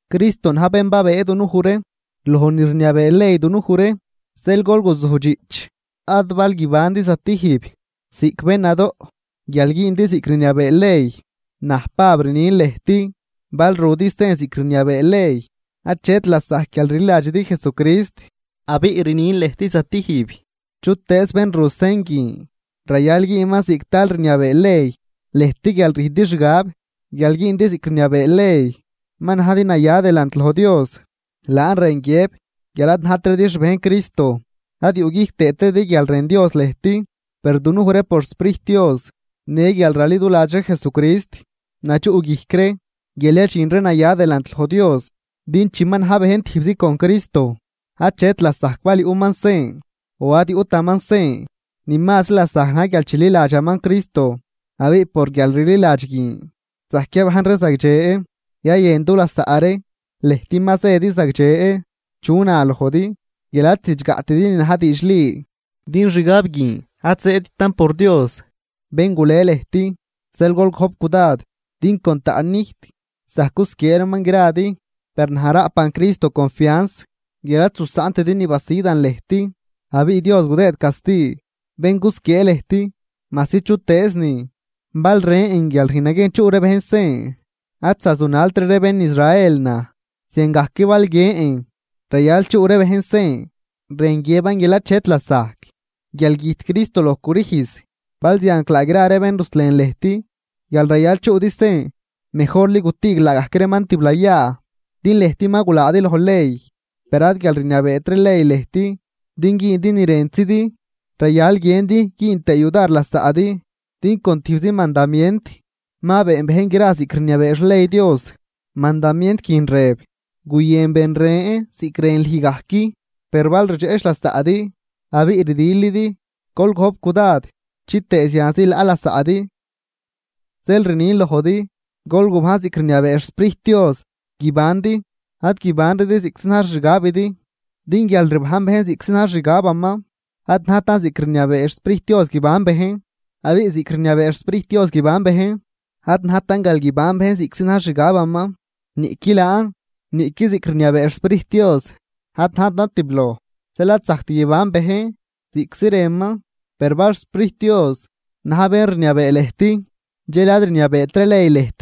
Cristo na̱j bén babëë dunuj ree loj ni rniabee ley dunuj ree. Zeel gol guzujdxiꞌch, ad bal guibandi zatijb ziꞌc bén nadoꞌ guial güündi ziꞌc rniabee ley. Naj Pab rnin lëjt. Bal rudi sen ziꞌc rniabee ley, achet lasajc guial rliladxidi Jesucrist. Abiꞌ rnin lëjt zatijb: Chutëëz bén ru sen guin rayal güünman ziꞌc tal rniabee ley. Lëjt guial rüjndi xgab guial güündi ziꞌc rniabee ley ma najdi naya delant loj Dios, laan rën guiëb guial ad najtridi xbejn Cristo ad yuꞌguijc tëëtridi guial rën Dios lëjt. Per dunuj ree por xSprijt Dios në guial raliduladx ree Jesucrist nadxuꞌguijc ree guial yadxin ree naya delant loj Dios. Din chi ma na̱j bejn tijbzi con Cristo achet lasajc bal yuꞌman sen o ad yuꞌtaman sen. Ni mazri lasajc na̱j guial chililadxaman Cristo. Abiꞌ por guialrliladx guin zajc yabajn ree zagdxe yayën dulasaꞌ ree. Lëjt ma zëdi zagdxe. ¿Chu na lojdi guial ad zidxgaꞌtidi ni na̱j diidxli? Din xgab guin ad zëëdtan por Dios, bén gule lëjt. Zeel gol gojp cudad “din con taꞌnnijt zajc gusquiee reeman gradi.” Per naj raꞌpan Cristo confians guial ad zusaꞌntidi ni basidan lëjt. Abiꞌ Dios gudëëd casti bén cusquiee ree lëjt, majsi chutëëznin. Bal rën guial rüjn naguiejn chuꞌ ree bejn sen, ad zazunaltri ree bén Israel naj. Ziangajc bal guiën guial rayal chuꞌ ree bejn sen, rën guiëban guial achet lasajc guial güjt Cristo loj crüjz. Balzianclaa gra ree bén ruslen lëjt guial rayal chuꞌdi sen, ¡mejorli gutüüg laagajc reeman tiblayaa! Din lëjt ma gulaadi loj ley, per ad guial ad rniabeetri ley lëjt din güündi ni rëntzidi, rayal guiëndi güün tëë yudar lasaꞌdi. Din con tijbzi mandamient ma been bejn gra ziꞌc rniabee xley Dios. Mandamient guin rëb: “Guyën ben ren ziꞌc rën lüj gajc.” Per bal rdxeꞌch lasaꞌdi abiꞌ rdilidi, gol gojp cudad chitëë zianzi laꞌ lasaꞌdi. Zeel rnin lojdi: Gol gubajn ziꞌc rniabee xSprijt Dios guibandi. Ad guibanridi ziꞌctzi na̱j xixgabidi. Din guial rbajn bejn ziꞌctzi na̱j xixgabaman, ad najtan ziꞌc rniabee xSprijt Dios guiban bejn. Abiꞌ ziꞌc rniabee xSprijt Dios guiban bejn, ad najtan guial guiban bejn ziꞌctzi na̱j xixgabaman. Niꞌqui laan niꞌqui ziꞌc rniabee xSprijt Dios ad najtan tibloj. Zeel ad zajct guiban bejn ziꞌctzi rënman. Per bal xSprijt Dios na̱j bén rniabee lëjt dxel ad rniabeetri ley lëjt.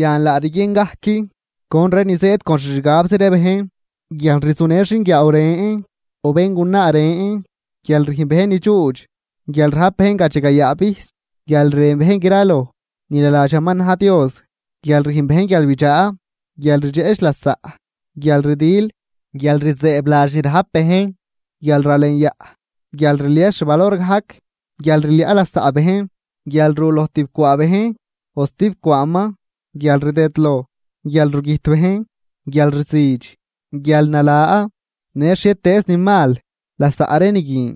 Yan laa rguien gajc con ree nin zëëd con xixgabzi ree bejn: Guialrzunë xinguiaaw ren o béngunaa ren, guialrüjn bejn nidxuudx, guialrajp bejn gadxagayaa vijs, guial rën bejn graloj ni naladxaman na̱j Dios, guial rüjn bejn guialbidxaa, guialrdxeꞌch lasaꞌ, guialrdil, guialrzëëbladx ni rajp bejn, guialralenyaꞌ, guialrlies xvalor gajc, guialrliaꞌ lasaꞌ bejn, guial ru loj tibcwaa bejn o stib cwaaman, guialrdëdloj, guialrugüjt bejn, guialrzüdx, guialnala në xhietëëz ni mal lasaꞌ ree ni guin.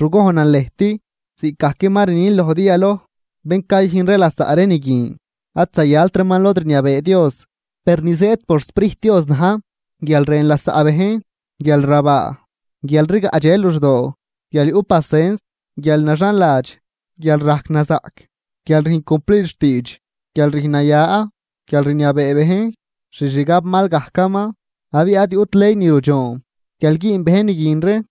Rugojnan lëjt ziꞌcgajc ma rnin lojdi yaloj, bén cayüjn ree lasaꞌ ree ni guin ad zayalt reeman lod rniabee Dios. Per ni zëëd por xSprijt Dios na̱j, guialrën lasaꞌ bejn, guialrabaa, guialrgaꞌdxe luxdoo, guial yuꞌ pacens, guialnaxanladx, guial rajc nazaꞌc, guial rüjn cumplid xtiidx, guial rüjn naya, guialrniabee bejn xixgab mal gajcaman. Abiꞌ ad yuꞌt ley ni rudxoon guial güün bejn ni guin ree.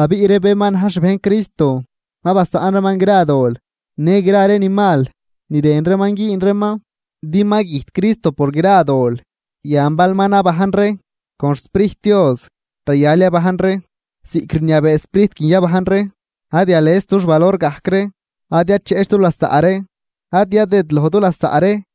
Abiꞌ ree bén ma na̱j xbejn Cristo ma basaꞌn reeman gra dol, në gra ree ni mal ni rën reeman güün reeman din ma güjt Cristo por gra dol. Yan bal ma nabajn ree con xSprijt Dios rayal yabajn ree ziꞌc rniabee Sprijt guin yabajn ree. Ad yales dux valor gajc ree, ad yacheꞌch du lasaꞌ ree, ad yadëdloj du lasaꞌ ree.